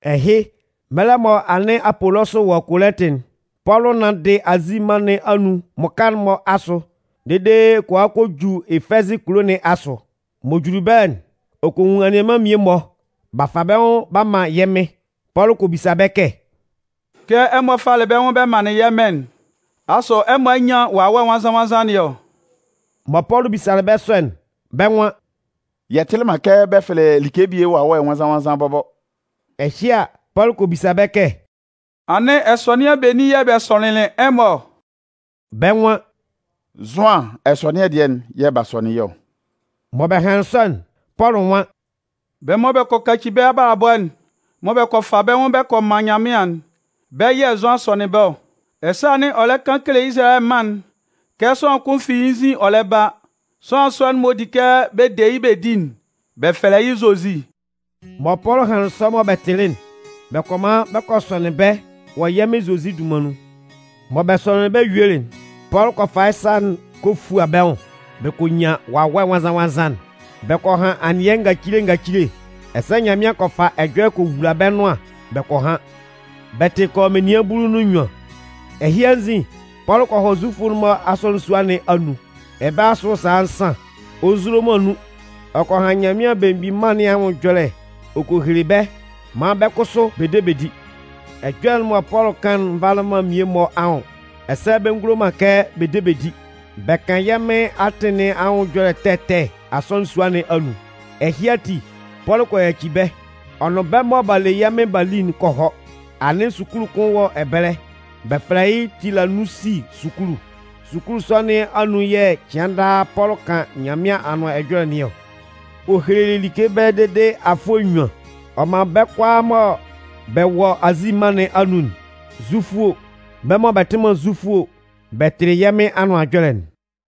Ɛhɩ, mɛlɛ mɔ anɩn Apolɔsʋ wɔ Kolɩntɩ'n, Pɔlʋ nanndɩ Azi mân nɩn anun mmʋka'n-mɔ asʋ dede ɔ kɔ a kɔ ju Efɛzɩ kulo nɩn asʋ. M'ɔ juli ɛbɛlɛ'n, ɔ kɔ nwun anianman mmie-mɔ, b'a fa bɛ́ nwʋn b'a man yɛ́ Mɩn. Pɔlʋ kɔ bisa bɛ́ kɛ: “Kɛ ɛmɔ falɩ bɛ́ nwʋn bɛ manlɩn yɛ́ Mɩn'n, asʋ ɛmɔ a nyan Wawɛ Nwannzan-nwannzan nɩn ɔ?” Mɔ Pɔlʋ bisalɩ bɛ́ sɔ'n, bɛ́ nwan: “Yɛ tɩlɩ man kɛ bɛ fɛlɛ like bie Wawɛ Nwannzan-nwannzan bɔbɔ.” Ɛhɩ a, Pɔlʋ kɔ bisa bɛ́ kɛ: “Anɩn ɛsɔnɩan benin yɛ̂ bɛ sɔnɩnlɩn ɛmɔ ɔ?” Bɛ́ nwan: “Zʋan ɛsɔnɩan dɩɛ'n yɛ̂ b'a sɔnɩn yɛ́ ɔ.” Mɔ bɛ hanlɩn sɔ'n, Pɔlʋ nwan: “Bɛ́ mɔ bɛ kɔ kaci bɛ́ abalabɔ'n mɔ bɛ kɔ fa bɛ́ nwʋn bɛ kɔ man Nyanmɩan'n, bɛ́ yɛ̂ Zʋan sɔnɩn bɛ́ ɔ. Ɛsɛ anɩn ɔ lɛ kan kele Izalayɛ mân'n kɛ sʋanlan kʋn fi yɩ́ nzin ɔ lɛ ba. Sʋanlan sɔ'n m'ɔ di kɛ bɛ de yɩ́ bɛ di'n, bɛ fɛlɛ yɩ́ Zozi.” Mɔ Pɔlʋ hanlɩn sɔ mɔ bɛ tɩlɩ'n, bɛ kɔ man bɛ kɔ sɔnɩn bɛ́ wɔ yɛ́ Mɩn Zozi dunman nun. Mɔ bɛ sɔnɩnlɩn bɛ́ yuelɩ'n, Pɔlʋ kɔ fa yɩ́ sa'n kɔ fua bɛ́ nwʋn bɛ kɔ nyan Wawɛ Nwannzan-nwannzan'n. Bɛ kɔ han anɩɛ ngacile ngacile ɛsɛ Nyanmɩan kɔ fa ɛjɔlɛ kɔ wula bɛ́ nʋan bɛ kɔ han. Bɛ tɩ kɔ yɔ menian bulu nʋn nnyuan. Ɛhɩ anzin, Pɔlʋ kɔ hɔ Zufʋ'n-mɔ asɔnɩn sua nɩn anun. Ɛbɛlɛ asʋ sala nsan, ɔ nzulo man nun, ɔ kan Nyanmɩan Belemgbin Mân nɩn anwʋn ɛjɔlɛ ɔ kele bɛ́ maan bɛ́ kʋsʋ bɛ de bɛ di. Ɛjɔlɛ'n mɔ Pɔlʋ kan'n nvalɩ man mmie-mɔ anwʋn ɛsɛ bɛ ngulo man kɛ bɛ de bɛ di. Bɛ kan yɛ́ Mɩn atɩn nɩn anwʋn ɛjɔlɛ ɛtɛ ɛtɛ asɔnɩn sua nɩn anun. Ɛhɩ ati, Pɔlʋ kɔ yaci bɛ́. Ɔ nʋn bɛ́ mɔ b'a le yɛ́ Mɩn b'a li'n kɔ hɔ. Anɩn sukulu kʋn wɔ ɛbɛlɛ, bɛ fɛlɛ yɩ́ Tilanunsi sukulu. Sukulu sɔ nɩn anun yɛ̂ cɩan daa Pɔlʋ kan Nyanmɩan Anʋan Ɛjɔlɛ nɩn ɔ. Ɔ helelɩ like ɛbɛlɛ dede afʋɛ nnyuan. Ɔ man bɛ́ kʋalaa mɔ bɛ wɔ Azi mân nɩn anun'n, Zufʋ o, bɛ́ mɔ bɛ tɩ man Zufʋ o, bɛ tɩlɩ yɛ́ Mɩn Anʋan Ɛjɔlɛ'n.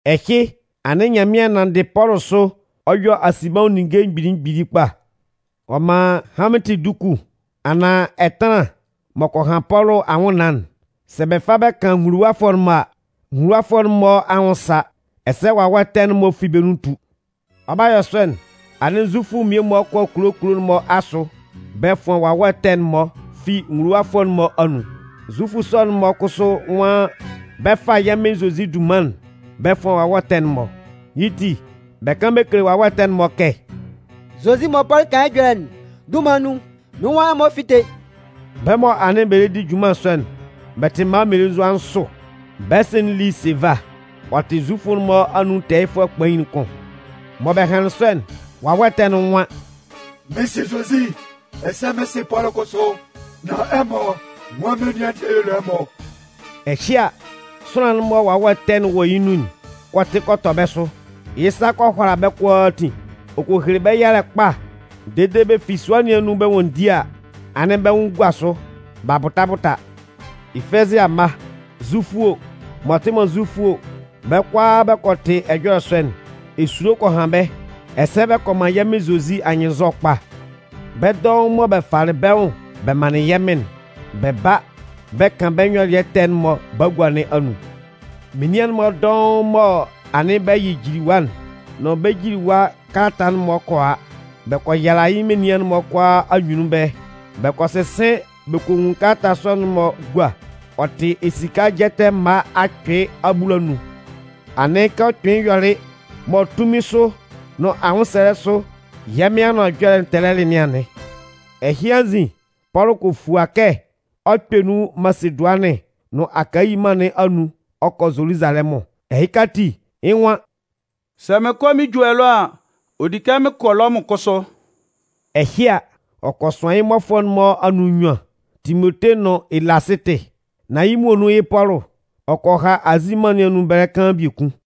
Ɛhɩ, anɩn Nyanmɩan nanndɩ Pɔlʋ sʋ ɔ yɔ asinbɛnwʋn ninnge mgbili mgbili kpa. Ɔ man hanmɩntɩ duku anaan ɛtanlan m'ɔ kɔ han Pɔlʋ anwʋnnaan'n, sɛ bɛ fa bɛ kan nwuluwafʋɛ'n-mɔ a, nwuluwafʋɛ'n-mɔ anwʋn sa, ɛsɛ wawɛ ɛtɛ'n-mɔ fi bɛ́ nun tu. Ɔ 'ba yɔ sɔ'n, anɩn Zufʋ mmie-mɔ kɔ kulo kulo'n-mɔ asʋ bɛ fʋan wawɛ ɛtɛ'n-mɔ fi nwuluwafʋɛ'n-mɔ anun. Zufʋ sɔ'n-mɔ kʋsʋ nwan bɛ 'fa yɛ́ Mɩn Zozi dunman'n bɛ fʋan wawɛ ɛtɛ'n-mɔ. Yɩ́ ti, bɛ kan bɛ kele wawɛ ɛtɛ'n-mɔ kɛ: “Zozi mɔ Pɔlʋ kan yɩ́ ɛjɔlɛ'n dunman nun, mɩ́n nwan ɛmɔ fíte!” Bɛ́ mɔ anɩn bɛ lɛ di junman sɔ'n, bɛ tɩ mma mmelenzua nsʋ. Bɛ́ sɩ'n li Seva, ɔ tɩ Zufʋ'n-mɔ anun tɛɛyɩfʋɛ kpain'n kʋn. Mɔ bɛ hanlɩn sɔ'n, wawɛ ɛtɛ'n nwan: “Mɩn sɩ Zozi ɛsɛ mɩn sɩ Pɔlʋ kʋsʋ. Nan ɛmɔ, nwan menian dɩɛ y'ɔ le ɛmɔ?” Ɛhɩ a, sʋanlan'n mɔ wawɛ ɛtɛ'n wɔ yɩ́ nun'n kɔ tɩ kɔ tɔ bɛ́ sʋ. Yɩ́ sa kɔ hʋala bɛ́ kʋalaatin, ɔ kɔ hele bɛ́ yalɛ kpa dede bɛ fi sua nɩn anun bɛ 'nwanndi a, anɩn bɛ́ nwʋn gua sʋ b'a bʋta bʋta. Efɛzɩ amma, Zufʋ o, m'ɔ tɩ man Zufʋ o, bɛ́ kʋalaa bɛ kɔ tɩ ɛjɔlɛ sɔ'n, esulo kɔ han bɛ́. Ɛsɛ bɛ kɔ man yɛ́ Mɩn Zozi anyɩnnzɔ kpa. Bɛ́ dɔʋn mɔ bɛ falɩ bɛ́ nwʋn bɛ manlɩn yɛ́ Mɩn'n, bɛ ba bɛ kan bɛ́ nyɔlɩɛ ɛtɛ'n-mɔ bagua nɩn anun. Menian'n-mɔ dɔʋn mɔ anɩn bɛ yɩ jiliwa'n nʋn bɛ́ jiliwa kalata'n-mɔ kɔ a. Bɛ kɔ yala yɩ́ menian'n-mɔ kʋalaa anyunnun ɛbɛlɛ. Bɛ kɔ sɩsɩn bɛ kɔ nwun kalata sɔ'n-mɔ gua, ɔ tɩ esika jɛtɛ mma akpɩɩ abulanun. Anɩn kɛ ɔ kpɩnlɩn yɔlɩ mɔ tunmin sʋ nʋn anwʋnsɛlɛ sʋ yɛ́ Mɩn Anʋan Ɛjɔlɛ'n tɛlɛlɩ nɩn anɩn. Ɛhɩ anzin, Pɔlʋ kɔ fua kɛ ɔ 'kpɛ nun Masedʋanɩn nʋn Akayi mân nɩn anun ɔ kɔ Zoluzalɛmʋn. Ɛhɩka ati, yɩ́ nwan: “Sɛ mɩn kɔ mɩn ju ɛlɔ a, ɔ di kɛ mɩn kɔ Lɔmʋn kʋsʋ.” Ɛhɩ a, ɔ kɔ sʋan yɩ́ mmʋkafʋɛ'n-mɔ anun nnyuan, Timote nʋn Elasɩtɩ. Nan yɩ́ muonun yɩ́ Pɔlʋ, ɔ kɔ ha Azi mân nɩn anun ɛbɛlɛ kaan biekun.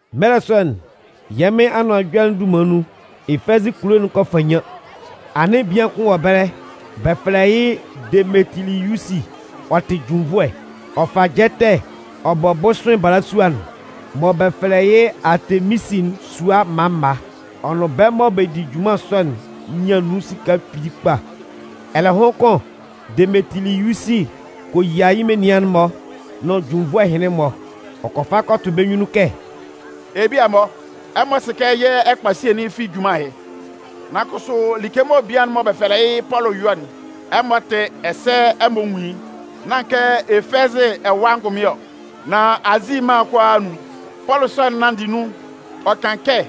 Mɛlɛ sɔ'n, yɛ́ Mɩn Anʋan Ɛjɔlɛ'n dunman nun, Efɛzɩ kulo'n kɔ fannyan. Anɩn bian kʋn wɔ ɛbɛlɛ, bɛ fɛlɛ yɩ́ Demetiliyusi. Ɔ tɩ junnvʋɛ. Ɔ fa jɛtɛ ɔ bɔ bʋsʋɩn balasua'n mɔ bɛ fɛlɛ yɩ́ Aateminsi'n sua mma mma. Ɔ nʋn bɛ́ mɔ bɛ di junman sɔ'n nyan nun esika kpili kpa. Ɛlɛhʋn kʋn, Demetiliyusi kɔ yia yɩ́ menian'n-mɔ nʋn junnvʋɛ ɛhɩnlɩn-mɔ. Ɔ kɔ fa kɔ tʋ bɛ́ nyunnun kɛ: “Ebia-mɔ, ɛmɔ sɩ kɛ yɛ́ ɛkpasie'n fi junman ɛhɩ. Nan kʋsʋ, like mɔ bian'n mɔ bɛ fɛlɛ yɩ́ Pɔlʋ yɔ'n, ɛmɔ tɩ ɛsɛ ɛmɔ nwun yɩ́. Nán kɛ Efɛzɩ ɛwa angʋnmɩn ɔ, nan Azi mân'n kʋalaa anun, Pɔlʋ sɔ'n nanndɩ nun ɔ kan kɛ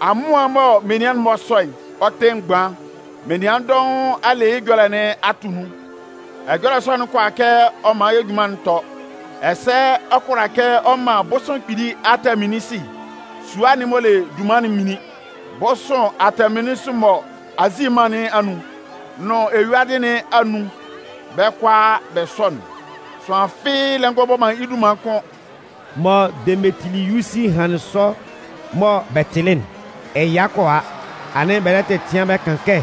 amʋan'n mɔ menian'n-mɔ sɔ'n, ɔ tɩ mgban. Menian dɔʋn a le yɩ́ ɛjɔlɛ nɩn a tʋ nun. Ɛjɔlɛ sɔ'n kʋala kɛ ɔ man yɛ́ junman'n tɔ, ɛsɛ ɔ kʋala kɛ ɔ man bʋsʋɩn kpili Aateminsi sua'n m'ɔ le dunman'n minlin. Bʋsʋɩn Aateminsi mɔ Azi mân nɩn anun nʋn eyuadɩ nɩn anun bɛ́ kʋalaa bɛ sɔ'n, sʋanlan fɩ́ɩ́ lɛ ngɔ bɔ yɩ́ dunman kʋ́n!” Mɔ Demetiliyusi hanlɩn sɔ mɔ bɛ tɩlɩ'n, ɛya kɔ a, anɩn bɛ lɛ tɛtɩan bɛ kan kɛ: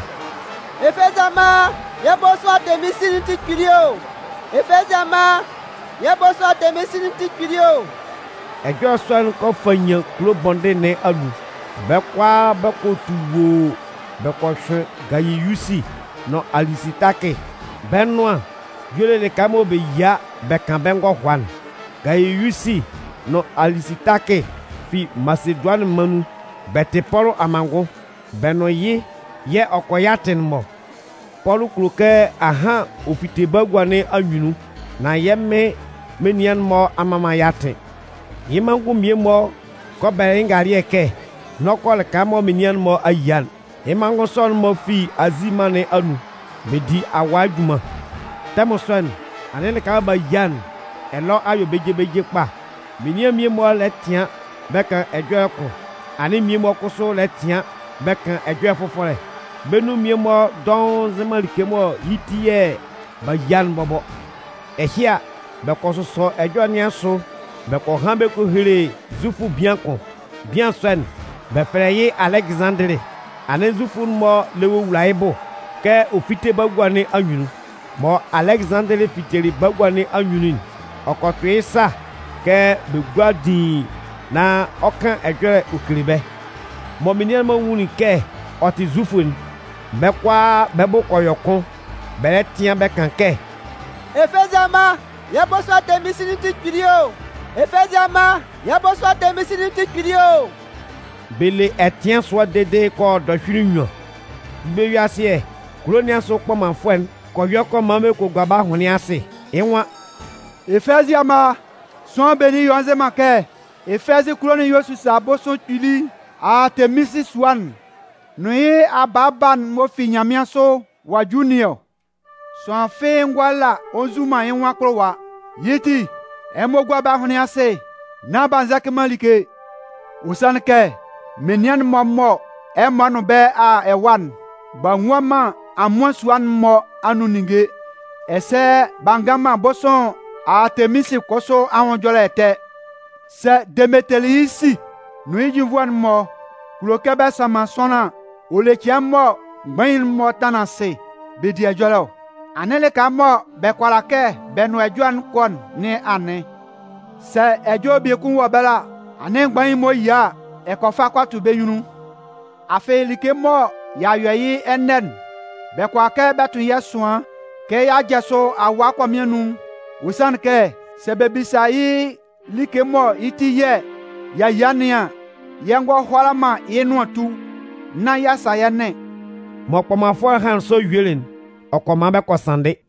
“Efɛzɩ amma, yɛ́ bʋsʋɩn Aateminsi'n tɩ kpili o! Efɛzɩ amma yɛ́ bʋsʋɩn Aateminsi'n tɩ kpili o!” Ɛjɔlɛ sɔ'n kɔ fannyan kulo bɔndɩn nɩn anun. Bɛ́ kʋalaa bɛ kɔ tu woo bɛ kɔ hyʋɩn Gayiyusi nʋn Alisitakɩ, bɛ́ nʋan y'ɔ le lɩka mɔ bɛ yia bɛ kan bɛ́ ngɔhʋa'n. Gayiyusi nʋn Alisitakɩ fi Masedʋanɩn mân nun. Bɛ tɩ Pɔlʋ amanngʋn. Bɛ nʋn yɩ́ yɛ̂ ɔ kɔ yɩ́ atɩn'n-mɔ. Pɔlʋ kulo kɛ ahan ɔ fite bagua nɩn anyunnun, nan yɛ́ Mɩn menian'n-mɔ a mman man yɩ́ atɩn. Yɩ́ manngʋn mmie-mɔ kɔ bɛlɛ yɩ́ ngalɩɛ kɛ n'ɔ kɔ lɩka mɔ menian'n-mɔ a yia'n. Yɩ́ manngʋn sɔ'n-mɔ fi Azi mân nɩn anun, bɛ di awaa junman. Tɛmʋn sɔ'n, anɩn lɩka mɔ b'a yia ɛlɔ a yɔ beje beje kpa. Menian mmie-mɔ lɛ tɩan bɛ kan ɛjɔlɛ kʋn, anɩn mmie-mɔ kʋsʋ lɛ tɩan bɛ kan ɛjɔlɛ fʋfɔlɛ. Bɛ́ nun mmie-mɔ dɔʋn nzɩ man like mɔ yɩ́ ti yɛ̂ b'a yia'n bɔbɔ. Ɛhɩ a, bɛ kɔ sʋsɔ ɛjɔlɛ nɩn asʋ bɛ kɔ han bɛ kɔ hele Zufʋ bian kʋn. Bian sɔ'n, bɛ fɛlɛ yɩ́ Alɛgɩzanndɩlɩ. Anɩn Zufʋ'n-mɔ lɛ wowula yɩ́ bʋ kɛ ɔ fíte bagua nɩn anyunnun. Mɔ Alɛgɩzanndɩlɩ fitelɩ bagua nɩn anyunnun'n, ɔ kɔ tʋ yɩ́ sa kɛ bɛ gúa diin nán ɔ 'kan ɛjɔlɛ ɔ kele bɛ́. Mɔ menian'n-mɔ nwunlin kɛ ɔ tɩ Zufʋ'n, bɛ́ kʋalaa bɛ́ bʋ kɔ yɔ kʋn bɛ lɛ tɩan bɛ kan kɛ: “Efɛzɩ amma, yɛ́ bʋsʋɩn Aateminsi'n tɩ kpili o! Efɛzɩ amma, yɛ́ bʋsʋɩn Aateminsi'n tɩ kpili o!” Bɛ le ɛtɩan sʋa dede kɔ yɔ dɔhyʋɩlɩ nnyuan. Yɩ́ bɛ-yue-asɩɛ, kulo nɩn asʋ kpɔmanfʋɛ'n kɔ yɔ kɔ man bɛ kɔ gua bɛ́ ahʋnlɩn asɩ. Yɩ́ nwan: “Efɛzɩ amma, sʋanlan benin y'ɔ nzɩ man kɛ Efɛzɩ kulo'n yɛ̂ ɔ sisa bʋsʋɩn kpili Aateminsi sua'n nʋn yɩ́ abaaba'n m'ɔ fi nyanmɩansʋ ɔ'a ju nɩn ɔ? Sʋanlan fɩ́ɩ́ ngʋala ɔ nzu man yɩ́ nwʋn akpʋlʋwa. Yɩ́ ti, ɛmɔ gúa bɛ́ ahʋnlɩn asɩ nán b'a nzɛcɩ man like. Ɔ sanlɩn kɛ menian'n-mɔ mɔ ɛmɔ nʋn bɛ́ a a ɛwa'n, b'a nwua man amʋan sua'n-mɔ anun ninnge, ɛsɛ b'a ngan man bʋsʋɩn Aateminsi kʋsʋ anwʋn ɛjɔlɛ ɛtɛ. Sɛ Demetiliyusi nʋn yɩ́ junnvʋɛ'n-mɔ kulo kɛ bɛ sanman sʋanlan an, ɔ le cɩan mɔ mgbain'n-mɔ tanlan asɩ bɛ di ɛjɔlɛ ɔ. Anɩn lɩka mɔ bɛ kʋala kɛ bɛ nʋn bɛ́ ɛjɔlɛ'n kɔ nɩn anɩn! Sɛ Ɛjɔlɛ biekun wɔ ɛbɛlɛ a, anɩn mgbain'n-mɔ yia a, ɛmɔ kɔ fa kɔ tʋ bɛ́ nyunnun. Afɩ like mɔ y'a yɔ yɩ́ ɛnɛ'n, bɛ kʋala kɛ bɛ tʋn yɛ́ ɛsʋan kɛ y'a jasʋ awaa akɔmɩn anun. Ɔ sanlɩn kɛ, sɛ bɛ bisa yɛ́ like mɔ yɩ́ ti yɛ̂ y'a yia nɩn an, yɛ ngɔ hʋala man yɩ́ nʋan tu nán y'a sa yɛ́ nɩn.” Mɔ kpɔmanfʋɛ'n hanlɩn sɔ yuelɩ'n, ɔ kɔ man bɛ kɔ sanndɩ.